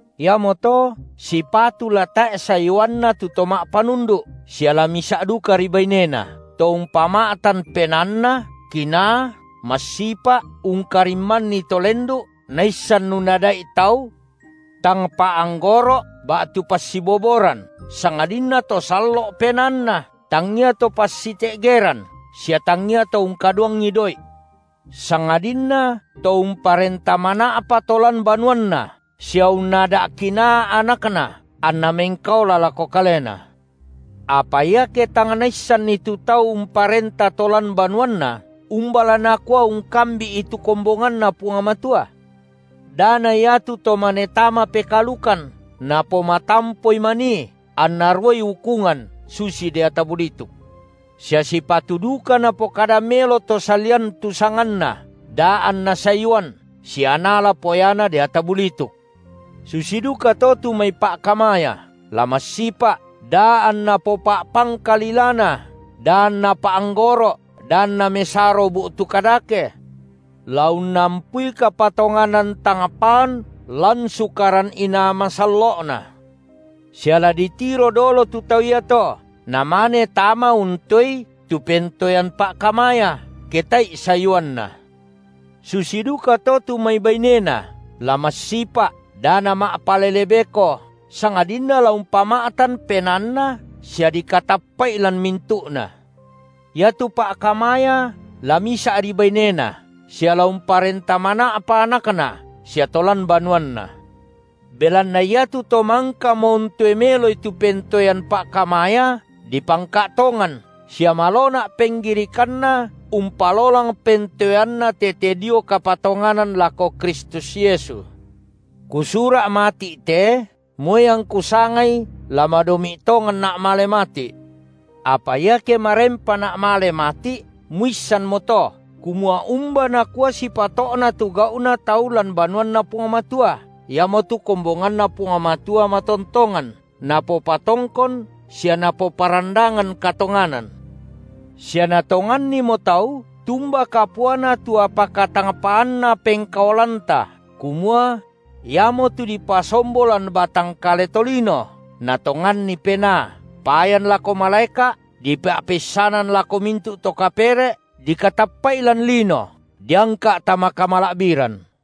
Iamoto sipatu la tae’ sayuanna tu to ma’panundu’ sia la misa’ dukari bainena, to umpama’tan penaanna, kinaa, massipa’, ungkarimmanni to lendu’, naissan unnadai’ tau, tang pa’anggoro’, ba’tu passiboboran, sangadinna to sallo’ penaanna, tangia to passite’geran sia tangia to ungkaduangi doi’; sangadinna to umparenta mana’pa to lan banuanna sia unnada’ kinaa anakna anna mengkaola lako kalena. Apa iake tang naissanni tu tau umparenta to lan banuanna, umba la nakua ungkambi’i tu kombonganNa Puang Matua? Da na ia tu to mane tama pekaalukan, napomatampoi manii, anna ruai ukungan susi deata bulituk. Sia sipatu duka napokada melo to salian tu sanganna da anna sayuan sia naala poyana deata bulituk. Susi dukato tu mai pa’kamaya, la massipa’, da anna popa’pangka lilana, da anna pa’anggoro’ da anna mesaro bu’tu kadake; la unnampui kapatonganan tang paan lan sukaran inaa masallo’na. Sia la ditiro dolo tu tau iato, namane tama untoei tu pentoean pa’kamaya, ke tae’i sayuanna. Susi dukato tu mai baine (na) la massipa’, da nama’palele beko, sangadinna la umpama’tan penaanna sia dikatappa’i lan mintu’na. Iatu pa’kamaya la misa’ri bainena, sia la umparenta mana’pa anakna sia to lan banuanna. Belanna iatu to mangkamo untoe meloi tu pentoean pa’kamaya, dipangka’ tongan sia malona’ penggirikanna umpalolang pentoeanna tete dio kapatonganan lako Kristus Yesu. Kusura’ mati’ te, moi angku sangai la madomi’ tonganna’ male mati’. Apa iake marempana’ male mati’, muissanmo to, kumua umba nakua sipato’na tu gau’na tau lan banuanNa Puang Matua, iamotu kombonganNa Puang Matua matontongan, napopatongkon sia napoparandangan katonganan. Sia natongannimo tau tumba kapuana tu apa katangpaanna pengkaolanta kumua: Iamotu dipasombo lan batang kale tolino, Natonganni Penaa, payan lako malaeka’, dipa’peissanan lako mintu’ to kapere’, dikatappa’i lan lino, diangka’ tama kamala’biran.